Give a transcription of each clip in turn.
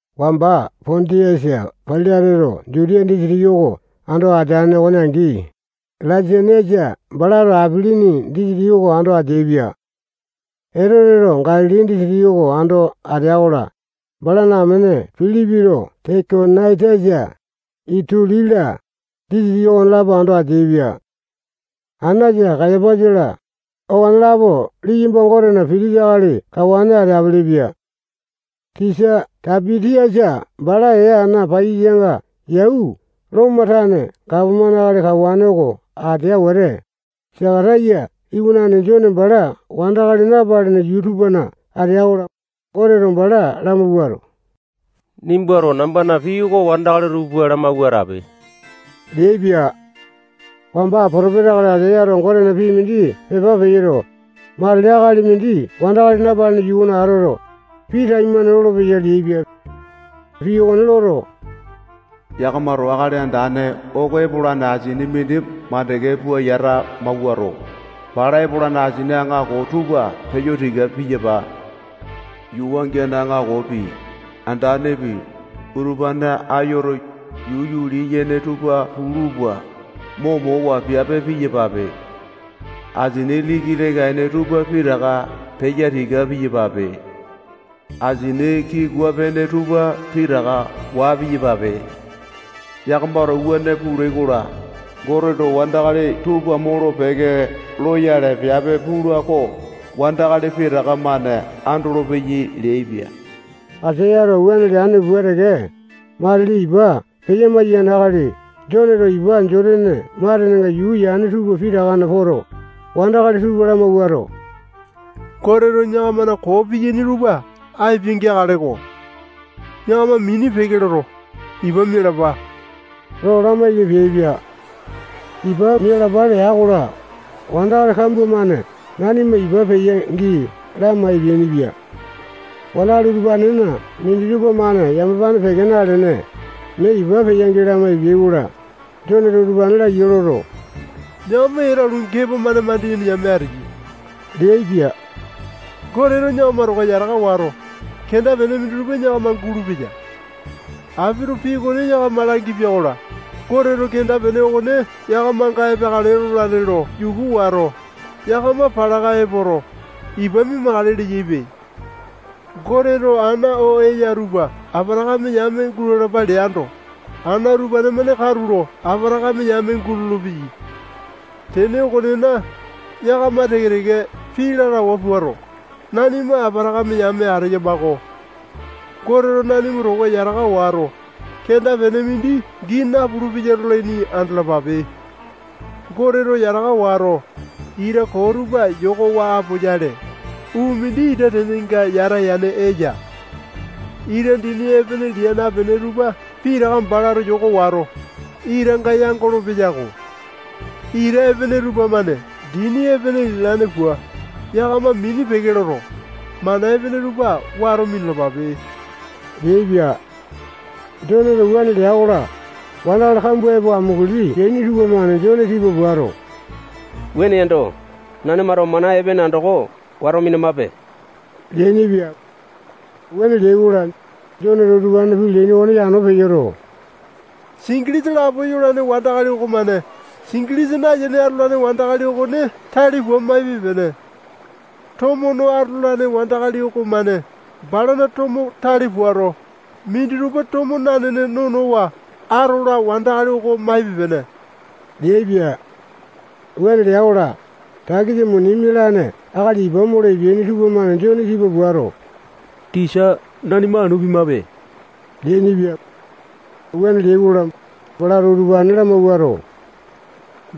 Wamba Pondiasa Pailateto Jutiya disitiki oko ando ateane okone angi, Laisaniasa balato Apilini disitiki oko ando ateaipia. Etoteto Galili disitiki oko ando atea-kola, balana amene Pilipito Tekonaitasa, Itulia-la, disitiki okonelapo ando ateaipia. Anasa, Kayapasa-la, okonelapo liyamba Gotena pitisa akali kawane ateapele-pia. Sisa Taipi-tiasa bala ee ana paiyasanga yau Lomo tane gapomane akali kawane oko atea wete, Sakataya iwanane Jone bala wandakali napalene yuu tupana atea-kola, Goteto bala lamawuato, nimbato nambana pii oko wandakali tupa lamawua atape leaipia. Wamba potopesa akali Aisayato Gotena pii mindi pepa peyoto, matili akali mindi wandakali napalene yuu okona atoto, pii taimane lolopeya leaipia. Pii okone loto, yakamato Akali Andane oko epolane asini mindi mandeke pua yata mawuato, bala epolane asini aŋako tupa peya tika piyapa. Yuu wangiane aŋakopi, andanepi, utupane ayoto, yuu yuli-yene tupa pulu pua, momowa piape piyapape. Asini liki leka-ene tupa pitaka peya tika piyapape. Asini kikua-pene tupa pitaka waa piyapape. Yakamato wuane pulai-kola, Goteto wandakali tupa molo-peke loyale piape pula oko wandakali pitaka-mane andolopeyai leaipia. Aisayato wuane leane pua teke, matili ipa peya-maiyane akali Joneto ipa Jotane matenenga yuu yane tupa pitakana poto, wandakali tupa lamawuato, Goteto yakamana koo piyaini tupa apia-geakaleko. Yakama mini peke loto, ipa mialapa lo lamaiki peaipia. Ipa mialapa lea-kola, wandakali kambua-mane nanima ipa peya-gii lama epeainipia. Wandakali utupanena minditupa-mane yamapane peke nalene, mee ipa peya-gii lama epeai-kola, Joneto utupane laiya loto, yakama etelu gepo-mane mandiyene yame ateyai leaipia. Goteto yakama towa yataka wato, kenda-pene minditupa yakama gulupeya. Apito pii okone yakama langipia-kola, Goteto kenda-pene okone yakamanga epeakale lolane lo yuku wato, yakama palaka epoto, ipa mia-makale leyaipe. Goteto ana oo eya utupa Apatakame yame gulalapa leando, ana utupa-mane katulo Apatakame yame gulolo-peyai. Tene okonena, yakama teke-teke pii lalawa puato, nanima Apatakame yame ateyama-ko. Goteto nanima towa yataka wato, kenda-pene mindi gii napulu-peya lolaini andalapape. Goteto yataka wato, ita koo tupa yokowa apoyale, uu mindi ita tenenga yata yane eya. Ita dini epene lia napene tupa pitaka balato yoko wato, itanga yangolo-peyako. Ita epene tupamane dini epene lialaini pua, yakama mini peke loto, mana epene tupa wato minalapape leaipia. Joneto wuane lea-kola, wandakali kambua epo amunguli peaini tupamane Jone tipa puato, wuane yando, nanimato mana epene andoko wato minamape leainipia. Wuane leai-kola, Joneto utupanena pii leaini okone yano peyoto, singilisa lapo yolane wandakali okomane singilisa nayene atolane wandakali okone tale pua maipe-pene. Tomo no atolane wandakali okomane balana tomo tale puato, minditupa tomo nanene nonowa atola wandakali oko maipe-pene leaipia. Wuane lea-kola, takisa muni mialane akali ipa molo epeaini tupamane Jone tipa puato, tisa, nanima anu pimape leainipia. Wuane leai-kola, balato utupane lamawuato,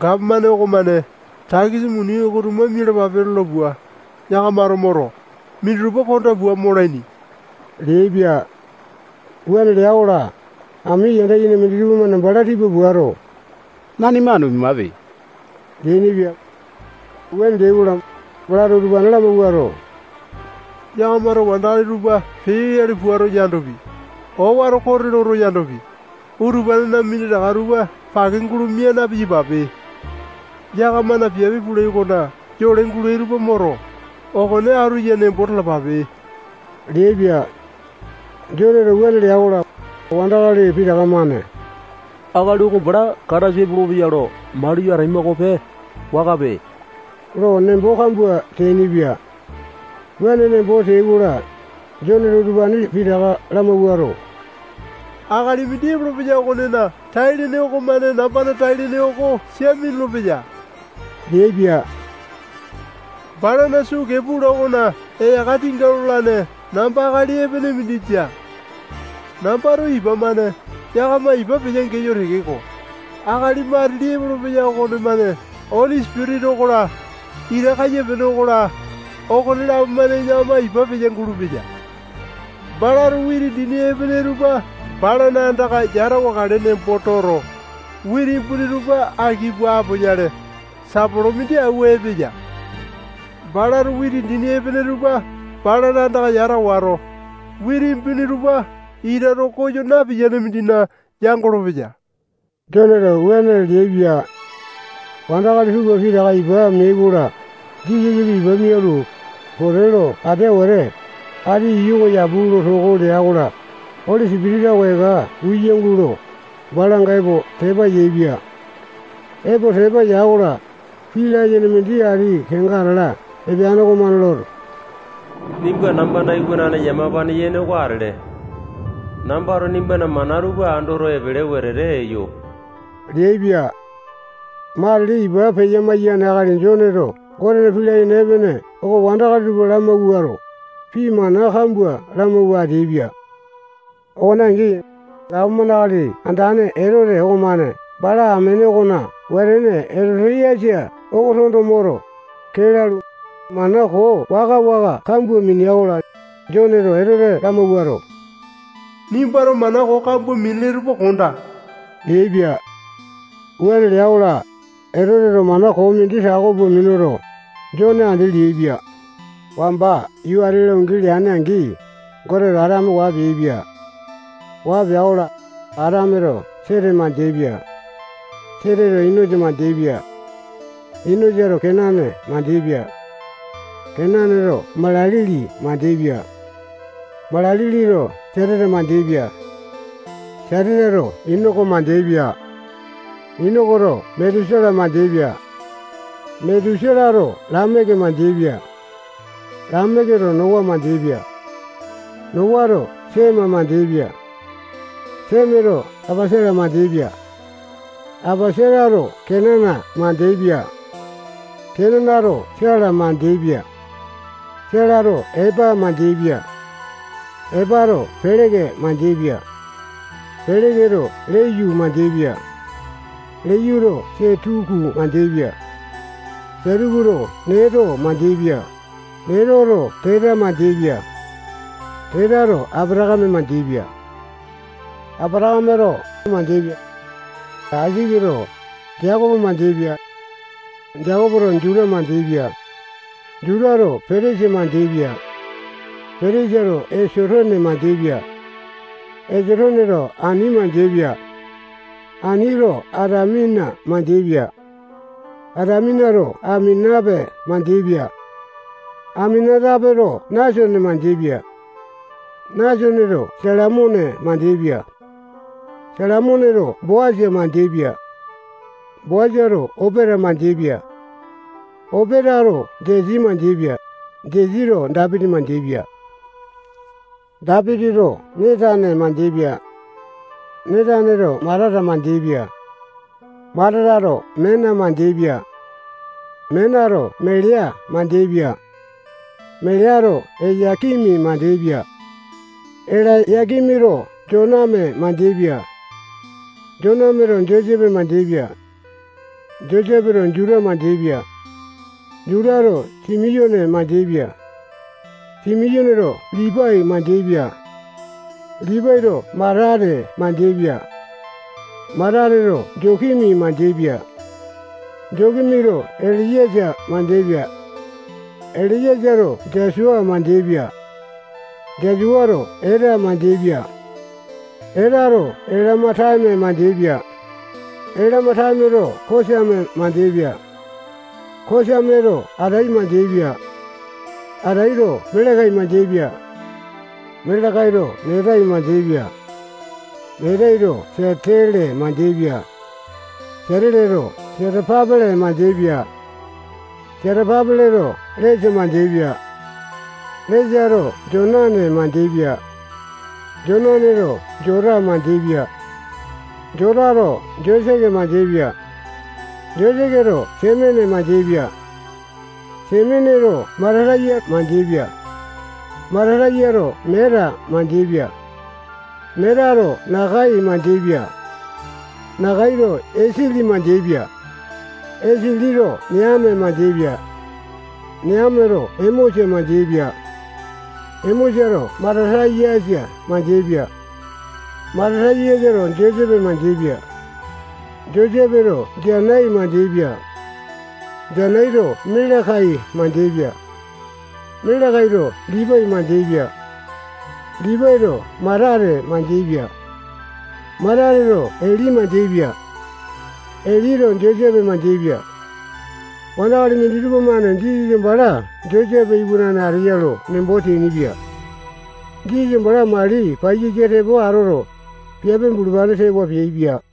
gapomane okomane takisa muni oko tuma mialapape lola pua, yakamato moto, minditupa konda pua molaini leaipia. Wuane lea-kola, ami yanda yene minditupa-mane bala tipa puato, nanima anu pimape leainipia. Wuane leai-kola, balato utupane lamawuato, yakamato wandakali tupa peyoyale puato yandopi, owato kote loto yandopi, utupanena minditaka tupa pake gulo mia na-piyapape. Yakamana piape pulai okona yole gulai tupa moto, okone atu ya nembo talapape leaipia. Joneto wuane lea-kola, wandakali pitaka-mane akali oko bala Kataisa epolopeya lo maliyo ataima okope, wakape, lo nembo kambua teainipia. Wuane nembo teai-kola, Joneto utupane pitaka lamawuato, akali mindi epolopeya okonena tai-lene okomane nambana tai-lene oko sia minulu-peya leaipia. Balana sukee pula okona eyaka tinga lolane namba akali epene mindi jia. Nambato ipa-mane yakama ipa peya-geyo tekeko, akali matili epolopeya okonemane Oli Sipitisa okola, ita kaiyapiane okola, okonelapo-mane yakama ipa peya-gulupeya. Balato witi dini epene tupa balana andaka yatawakale nembo toto, witi imbuni tupa aki pua apoyale, sapolo mindi awua epeya. Balato witi dini epene tupa balana andaka yata wato, witi imbuni tupa ita too koyo napiyane mindina yangolo-peya. Joneto wuane leaipia. Wandakali tupa pitaka ipa meai-kola, Jisasapi ipa mialu, pote lo atea wete, ati iyu oko yapu lo toko lea-kola, Oli Sipitisa oko eka uya gulo, balanga epo tepa yaepia. Epo tepa ya-kola, pii layene mindi ati kenga atala epeane okomane loto, nimba nambana iwanane yamapane yene oko atele. Nambato nimbana mana tupa andoto, epele wetete eyo leaipia. Matili, ipa peya-maiyane akali Joneto Gotena pii layene epene oko wandakali tupa lamawuato, pii mana kambua lamawua ateaipia. Okone angi, Gapomane akali andane Etote okomane bala amene okona wetene Etoti-yasa oko tondo moto, kee lalu, mana koo waka-waka kambua minea-kola, Joneto Etote lamawuato, nimbato mana koo kambua minele tupa kondaa leaipia. Wuane lea-kola, Etoteto mana koo mindi tako pua minuto, Jone andi leaipia. Wamba yuu ati-la ungi leane-angi, Goteto Atame waa peaipia. Waa pea-kola, Atameto Sete mandeaipia. Seteto Inosa mandeaipia. Inosato Kenana mandeaipia. Kenanato Mala-lili mandeaipia. Mala-lilito Jateta mandeaipia. Jatetato Inoko mandeaipia. Inokoto Metusala mandeaipia. Metusalato Lameke mandeaipia. Lameketo Nowa mandeaipia. Nowato Sema mandeaipia. Semato Apasata mandeaipia. Apasatato Kenana mandeaipia. Kenanato Sela mandeaipia. Selato Epa mandeaipia. Epato Peleke mandeaipia. Peleketo Leyu mandeaipia. Leyuto Setuku mandeaipia. Setukuto Neto mandeaipia. Netoto Teta mandeaipia. Tetato Apatakame mandeaipia. Apatakameto Aisake mandeaipia. Aisaketo Jekopo mandeaipia. Jekopoto Juta mandeaipia. Jutato Petesa mandeaipia. Petesato Esotone mandeaipia. Esotoneto Ani mandeaipia. Anito Atamina mandeaipia. Ataminato Aminatape mandeaipia. Aminatapeto Nasone mandeaipia. Nasoneto Salamone mandeaipia. Salamoneto Boasa mandeaipia. Boasato Opeta mandeaipia. Opetato Jesi mandeaipia. Jesito Dapiti mandeaipia. Dapitito Netane mandeaipia. Netaneto Matata mandeaipia. Matatato Mena mandeaipia. Menato Melea mandeaipia. Meleato Elaya-kimi mandeaipia. Elaya-kimito Joname mandeaipia. Jonameto Josepe mandeaipia. Josepeto Juta mandeaipia. Jutato Simiyone mandeaipia. Simiyoneto Lipai mandeaipia. Lipaito Matate mandeaipia. Matateto Jotimi mandeaipia. Jotimito Eliyesa mandeaipia. Eliyesato Jasua mandeaipia. Jasuato Eta mandeaipia. Etato Elema-tame mandeaipia. Elema-tameto Kosame mandeaipia. Kosameto Atai mandeaipia. Ataito Melekai mandeaipia. Melekaito Netai mandeaipia. Netaito Siatele mandeaipia. Siateleto Setapa-pele mandeaipia. Setapa-peleto Lesa mandeaipia. Lesato Jonane mandeaipia. Jonaneto Jota mandeaipia. Jotato Joseke mandeaipia. Joseketo Semene mandeaipia. Semeneto Mata-tayasa mandeaipia. Mata-tayasato Meata mandeaipia. Meatato Nakai mandeaipia. Nakaito Esili mandeaipia. Esilito Neame mandeaipia. Neameto Emosa mandeaipia. Emosato Mata-tayasa mandeaipia. Mata-tayasato Josepe mandeaipia. Josepeto Janai mandeaipia. Janaito Melekai mandeaipia. Melekaito Lipai mandeaipia. Lipaito Matate mandeaipia. Matateto Eli mandeaipia. Elito Josepe mandeaipia. Wandakali minditupa-mane Jisasa bala Josepe iwanane ateya ya lo nembo teainipia. Jisasa bala mali paiyasa tepo atoto, piape bulupane tewa peaipia.